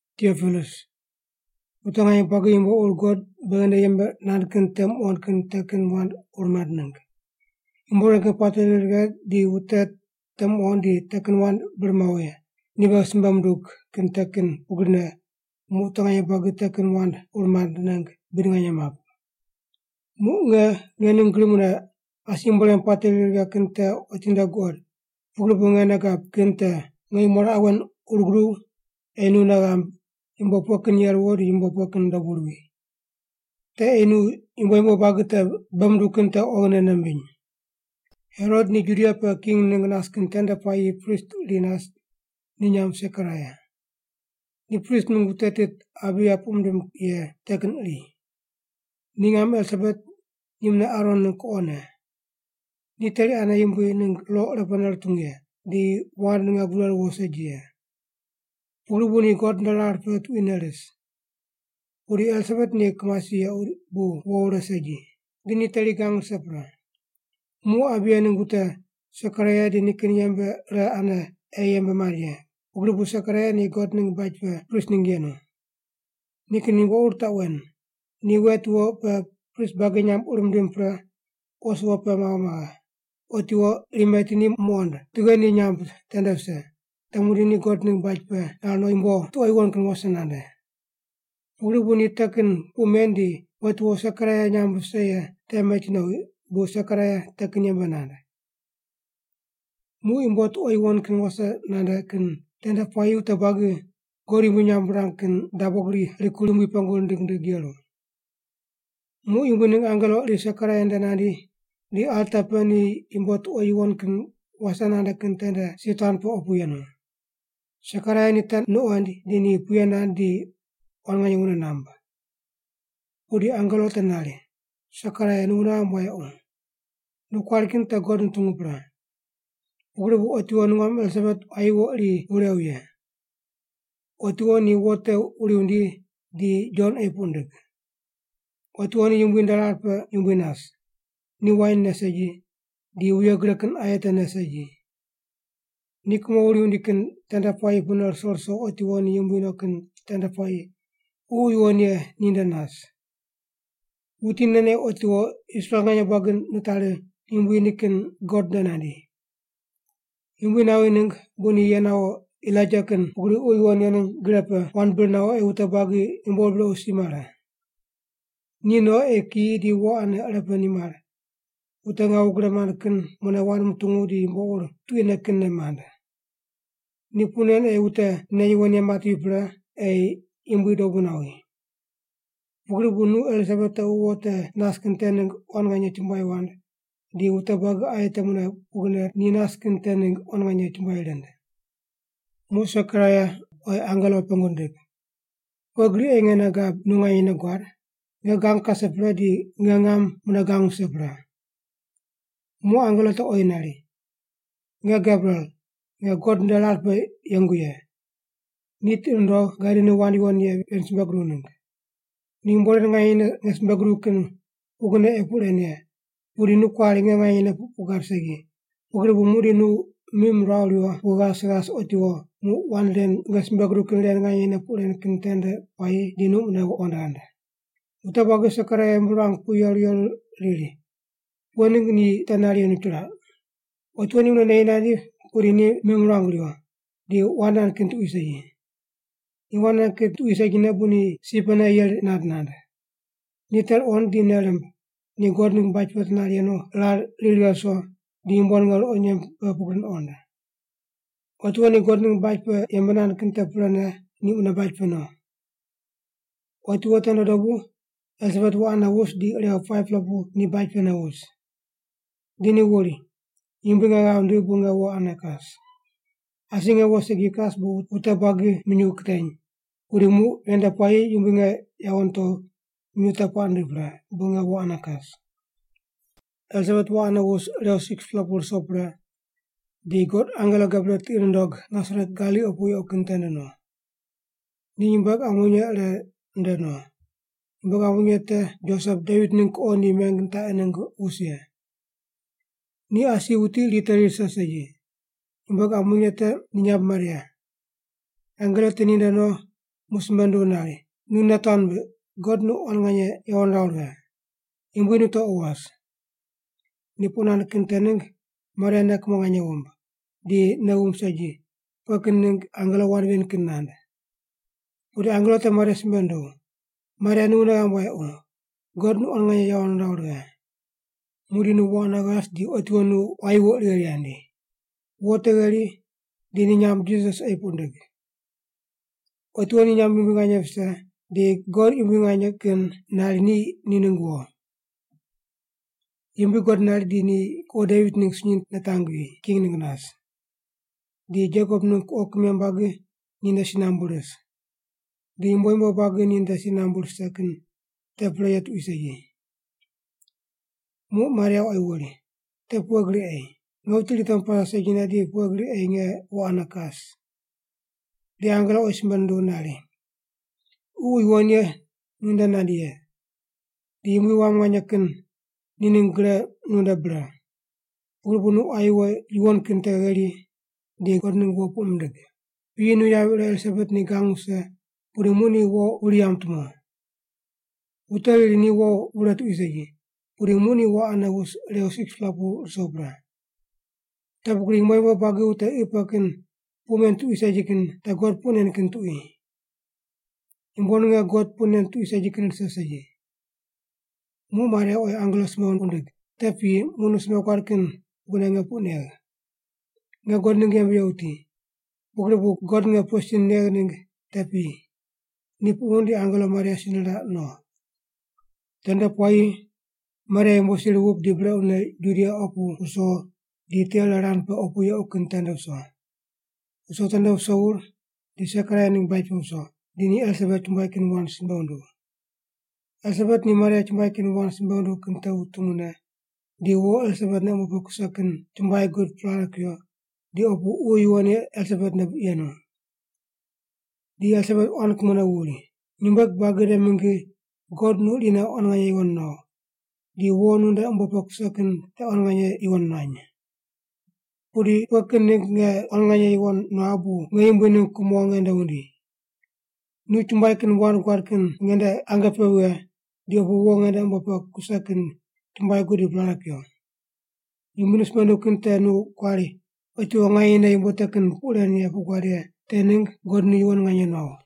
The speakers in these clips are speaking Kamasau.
Tiopilus Wute nganye buagi yumbo ur God beghi nde yembe nand kin te muqond kin te kin wand ur mand ningg. Yumbo ren kin puate ri righe di wute te muqond di te kin wand bir mawo ye, ni beghi simbe mundug kin te kin pugrine muq wute nganye buagi te kin wand ur mand ningg buid nganye map. Muq nge nge ning gri mune asi yumbo ren puate ri righe kin te otinde guqod, pugri bu nge nei gab kin te nge nyumo raqe wen ur guduw ei nu nei ghamb yumbo pughe kin ye ruwo di yumbo pughe kin dobu ruwi. Te ei nu yumbo yumbo buagi te bei munduw kin te oghine nei mbiny. Herot ni Judia pe king ningg nas kin tende puayi prist iri nas ni nyamb Sekaraia. Ni prist mingg wute tit Abiya puq mindim ye te kin iri. Ni ngam Elisabet ni mune Aron ningg kuqone. Ni teri ane Yumbui ningg lo irepene rutungu ye, di wand ninge gure ruwo segi ye. Pugri bu ni God nde rar pe tuquine ris. Pudi Elisabet ni kimasi yequ bu wo wure segi. Di ni teri gang rise pre. Muq Abiya ningg wute, Sekaraia di nikin yembe ire ane ei yembe mand ye, pugri bu Sekaraia ni God ningg baj pe prist ningg yenu. Nikin yumbo ur taq wen: Ni wet wo pe prist buagi nyamb ur mindim pre os wo pe mawo maghe, otiwo iri meti ni muqond tughe ni nyamb tende vise, te muqdi ni God ningg baj pe nar no yumbo tuqo yuwon kin wase nande. Pugri bu ni te kin puq men di wet wo Sekaraia nyamb vise ye te meti nowi bu Sekaraia te kin yembe nand. Muq yumbo tuqo yuwon kin wase nande kin tende puayi wute buagi God yumbui nyamb rirang kin dabo gri rikur Yumbui pengu rindig rindig yeru. Muq Yumbui ningg angelo iri Sekaraia nde nandi di alta pe ni yumbo tuqo yuwon kin wase nande kin tende si tuan pe opu yenu. Sekaraia ni te nuqoind di ni puye nand di quan nganye wune namb. Pudi angelo te nari, “Sekaraia nu wune ghamb wayequ. Nu kuari kin te God nutungu pre. Pugri bu otiwo nungam Elisabet quayi wo iri wurew ye. Otiwo ni wo te wuri wundi di Jon ei puq ndig. Otiwo ni Yumbui nde rar pe yumbui nas. Ni wain ne segi, di wuye gre kin aye te ne segi. Ni kumo wuri wundi kin tende puayi pune ruso ruso otiwo ni yumbui no kin tende puayi Ququ Yuwon Ye ni nde nas. Wuti nen ei otiwo Israel nganye buagi nitari Yumbui nikin God nde nandi. Yumbui nawi ningg bu ni ye nawo Elaija kin pugri Ququ Yuwon Ye ningg gre pe wand bir nawo ei wute buagi yumbo ur brequ si mare. Ni no ei kiyi di wo ane ire pe nimar, wute ngawu gre mand kin mune wand mutungu di yumbo ur tuquine kinne mand. Ni puq nen ei wute nei yuwon ye matevi pre ei Yumbui dobu nawi. Pugri bu nu Elisabet tequ wo te nas kin te ningg quan nganye chumbuai wand, di wute buagi aye te mune pugrine ni nas kin te ningg quan nganye chumbuai rind.” Muq Sekaraia oyi angelo pengu nindig, “Pughe gri ei nge nei gab nu nganyene guad? Nge gang kase pre di nge ngam mune gang wuse pre.” Muq angelo te oyi nari, “Nge Gebriel, nge God nde rar pe yengu ye, ni tiqi nundogh gadi nu wand yuwon ye ven simbe guduw ningg. Yumbo ren nganyene nge simbe guduw kin pugrine ei puq ren ye, pudi nu kuari nge nganyene puq gad segi, pugri bu muqdi nu mim ruaw riwo pu ghas ghas otiwo, muq wand ren nge simbe guduw kin ren nganyene puq ren kin tende puayi di nu mune wand ghand.” Wute buagi Sekaraia ghimbi ruang pu yeru yeru riri, “Pughe ningg ni te nar yenu chiraq?” Otiwo ni mune neyi nandi pudi ni mim ruang riwo, di wand nand kin tuqui segi. Ni wand nand kin tuqui segine bu ni si pene yeri nand nand. Ni te ruqond di nei rimb ni God ningg baj pe te nar yenu rar ri righe ruso di yumbo ninge ruqo nyemb pe pugri nuqond. Otiwo ni God ningg baj pe yembe nand kin te prene ni mune baj pe no. Otiwo tende dobu Elisabet wo ane wus di irew 5-pela pu ni baj pene wus. Di ni wuri, “Yumbui nge ghav nindigh bu nge wo ane kas. Asi nge wo segi kas bu wute buagi minyuw kiteny, pudi muq ven nde puayi Yumbui nge yawo nitogh minyuw te puaq nindigh pre bu nge wo ane kas.” Elisabet wo ane wus irew 6-pela pu ruso pre, di God angelo Gebriel tiqi nundog Nasaret Galili opu yequ kin tende no. Ni nyumbueg ambonye ire nde no. Nyumbueg ambonye te Josep Devit ningg kuqo ni meng nitaqi ningg wus ye. Ni asi wuti iri teri rise segi. Nyumbueg ambonye te ni nyamb Maria. Angelo te ni nde no muq simbe nunduw nari, “Nu nei tuan mbiq, God nu quan nganye yawo niraw righe. Yumbui nu tequ was.” Ni puq nand kin te ningg Maria nei kumo nganye wumb, di nei wumb segi pughe kin ningg angelo wand ven kin nand. Pudi angelo te Maria simbe nunduw, “Maria nu wune ghamb wayequ, God nu quan nganye yawo niraw righe. Muqdi nu wo ane ghas di otiwo nu quayi wo iri gheri ghandi. Wo te gheri di ni nyamb Jisas ei puq ndig. Otiwo ni nyamb yumbui nganye vise di God Yumbui Nganye Kin nari ni ni ningg wo. Yumbui God nari di ni kuqo Devit ningg sunyi nitangvi, king ningg nas. Di Jekop ningg kuqo kimem buagi ni nde si nambu ris. Di yumbo yumbo buagi ni nde si nambu rise kin te pre ye tuqui segi.” Muq Maria oyi wuri, “Te pughe gri ei? Nge wuti iri temu pase segine di pughe gri ei nge wo ane kas?” Di angelo oyi simbe nunduw nari, “Ququ Yuwon Ye nu nde nandi ye. Di Yumbui Wam Nganye Kin ni ningg gre nunde bre. Pugri bu nu quayi wo yuwon kin te gheri, di God ningg wo puq mindig. Piyi nu yavi ire Elisabet ni gang wuse pudi muq ni wo wuri yamb tumo. Wute riri ni wo wure tuqui segi, pudi muq ni wo ane wus irew 6-pela ruso pre. Te pugri yumbo yumbo buagi wute qi pe kin puq men tuqui segi kin te God puq nen kin tuqui. Yumbo ninge God puq nen tuqui segi kin rise segi.” Muq Maria oyi angelo simbe wundig, “Te piyi muq nu simbe guad kin pugrine nge puq negh. Nge God ningg yembe ye wuti. Pugri bu God nge pughe sin negh ningg te piyi.” Ni puq wund di angelo Maria si niraq no. Tende puayi Maria yumbo sir wup di brequne Judia opu wuso di tiqe ire rand pe opu yequ kin tende wuso. Wuso tende wuso wur di Sekaraia ningg baj pe wuso, di ni Elisabet chumbuai kin wand simbe wunduw. Elisabet ni Maria chumbuai kin wand simbe wunduw kin te wutungu ne, di wo Elisabet nde umbo pe kuse kin chumbuai gud prare kuyo, di opu Ququ Yuwon Ye Elisabet nde yenu. Di Elisabet quan kumone wuri, “Nyumbueg buagi nde mingi God nu irine quan nganye yuwon nuaw, di wo nu nde umbo pe kuse kin te quan nganye yuwon nuany. Pudi pughe kin ningg nge quan nganye yuwon nuagh bu nge Yumbui ningg kumo nge nde wundi? Nu chumbuai kin wand guad kin nge nde ange pe vighe di opu wo nge nde umbo pe kuse kin chumbuai gud di prare kuyo. Yumbui nu simbe nunduw kin te nu kuari otiwo nganyene yumbo te kin puq ren puq guad ye te ningg God nu yuwon nganye nuaw.”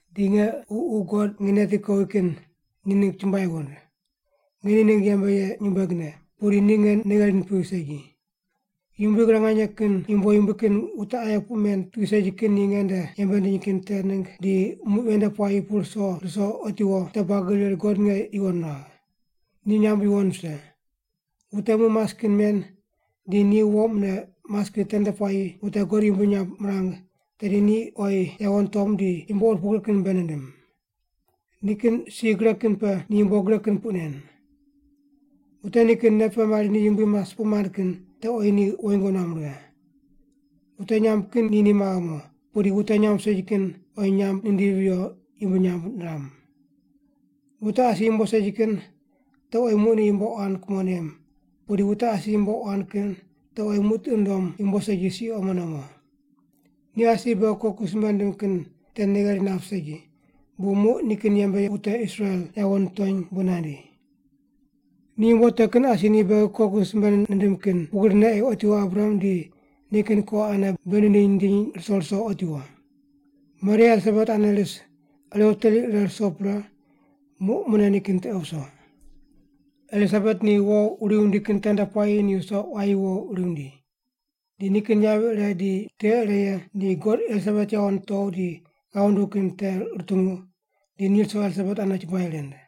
di nge ququ God nge neti kowi kin ni ningg chumbuai wund. Nge ni ningg yembe ye nyumbuegne, pudi ni nge nei gheri nipigh segi. Yumbui Gre Nganye Kin yumbo yumbui kin wute aye puq men tuqui segi kin ni nge nde yembe nindiny kin te ningg di muq ven nde puayi pune ruso ruso otiwo wute buagi riri God nge yuwon nuagh. Ni nyamb yuwon vise. Wute muq mas kin men di ni wo mune mas kin tende puayi wute God yumbui nyamb mirang tedi ni oyi yawo nitom di yumbo ur pugri kin bei nindim. Nikin si gre kin pe ni yumbo gre kin puq nen. Wute nikin nei pe mari ni yumbui mas puq mand kin te oyi ni woingo nuam righe. Wute nyamb kin ni ni maghe mo, pudi wute nyamb segi kin oyi nyamb nindivi viyo yumbui nyamb niram. Wute asi yumbo segi kin te oyi muq ni yumbo quan kumo nem, pudi wute asi yumbo quan kin te oyi muq tiqi nundom yumbo segi si omone mo. Ni asi beghi koku simbe nindim kin te nei gheri nap segi, bu muq nikin yembe ye wute Israel yawo nitony bu nandi. Ni yumbo te kin asi ni beghi koku simbe nindim kin pugrine ei otiwo Abraham di nikin kuqo ane bei nindiny nindinyne ruso ruso otiwo.” Maria Elisabet ane ris irew teri ire ruso pre muq mune nikin tiqe wuso. Elisabet ni wo wuri wundi kin tende puayi ni wuso quayi wo wuri wundi. Di nikin yavi ire di tiqe ire ye ni God Elisabet yawo nitow di ghav nunduw kin te rutungu, di ni ruso Elisabet ane chumbuai rind.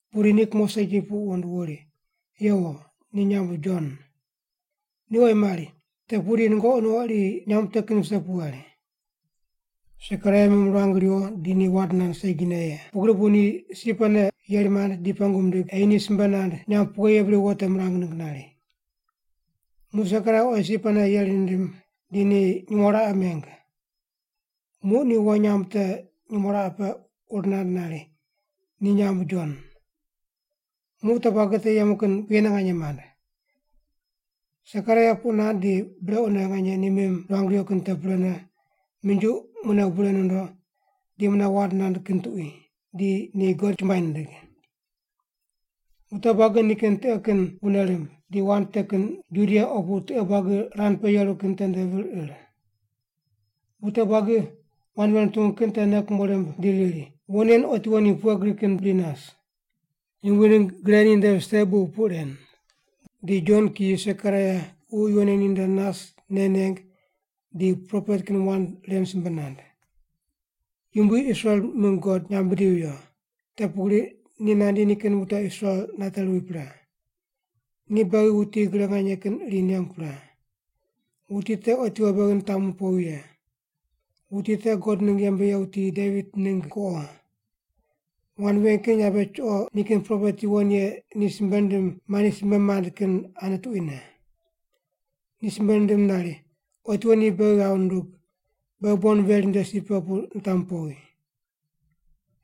Pudi ni kumo segi puq wund wuri, “Yewo! Ni nyamb Jon.” Ni oyi mari, “Te pudi nungoqi nuqo iri nyamb te kin vise pu ghari.” Sekaraia mim ruang riwo di ni wand nand segine ye, pugri bu ni si pene yeri mand di pengu mindig ei ni simbe nand nyamb pughe ye bri wo te mirang ningg nari. Muq Sekaraia oyi si pene yeri nindim di ni nyumo raqe meng. Muq ni wo nyamb te nyumo raqe pe ur nand nari, “Ni nyamb Jon.” Muq wute buagi te yemu kin puyene nganye mand. Sekaraia puq nand di brequne nganye ni mim ruang riwo kin te prene, minjuq mune bure nondo, di mune wand nand kin tuqui, di ni God chumbuai nindig. Wute buagi nikin tiqe kin wune rimb, di wand te kin Judia opu tiqe buagi rand pe yeru kin tende vir ir. Wute buagi wand ven rutungu kin te nei kumo rimb di riri, “Wo nen otiwo ni pughe gri kin bri nas?” Yumbui ningg gre ni nde vise bu puq ren. Di Jon kiyi Sekaraia Ququ Yuwon Ye ni nde nas nei neng di propet kin wand ren simbe nand: “Yumbui Israel mingg God nyamb bidivi viyo; te pugri ni nandi nikin wute Israel nate ruwi pre. Ni beghi wuti gre nganye kin iri nengu pre. Wuti te otiwo beghi nitamu powi ye. Wuti te God ningg yembe ye wuti Devit ningg kuqo. Wand ven kin yabe chuqo nikin propet yuwon ye ni simbe nindim mandi simbe mand kin ane tuquine. Ni simbe nindim nari otiwo ni beghi ghav nundug, beghi bon veri nde si pe pu nitamu powi.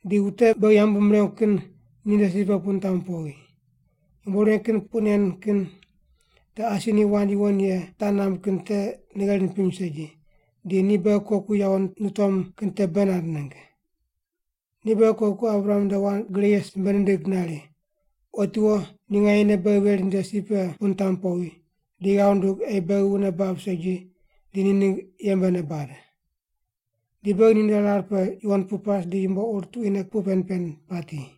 Di wute beghi yambu mirengu kin ninde si pe pu nitamu powi. Yumbo ren kin puq nen kin te asi ni wand yuwon ye taq namb kin te nei gheri nipiny segi, di ni beghi koku yawo nitom kin te bei nand ningg. Ni beghi koku Abraham nde wand gre ye simbe nindig nari, Otiwo ni nganyene beghi veri nde si pe pu nitamu powi, di ghav nundug ei beghi wune bab segi di ni ningg yembene bad. Di beghi ninde rar pe yuwon pu pas di yumbo ur tuquine puq pen pen pati.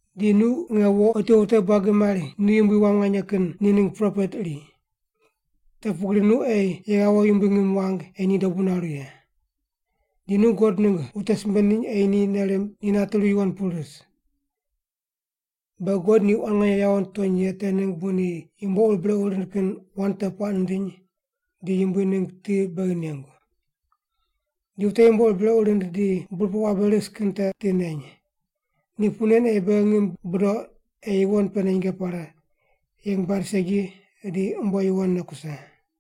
Di nu nge wo otiwo wute buagi mari nu Yumbui Wam Nganye Kin ni ningg propet iri. Te pugri nu ei ye ghawo Yumbui ngim wang ei ni dobu naru ye. Di nu God ningg wute simbe ndiny ei ni nei rimb ni nate ruwi yuwon pu ris. Beghi God ni quan nganye yawo nitony ye te ningg bu ni yumbo ur brequ rind kin wand te puaq nindiny di Yumbui ningg ti beghi nengu. Di wute yumbo ur brequ rind di burpoq wabe ris kin te ti neny. Ni puq nen ei beghi ngim budoq ei yuwon pene nyinge pare, yeng bad segi di umbo yuwonne kuse.”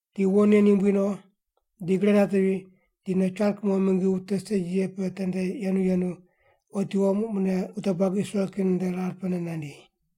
Di wo nen yumbui no di gre natevi, di no dabo char kumo mingi wute segi ye pe te yenu yenu, otiwo muq mune wute buagi Israel kin nde rar pene nandi.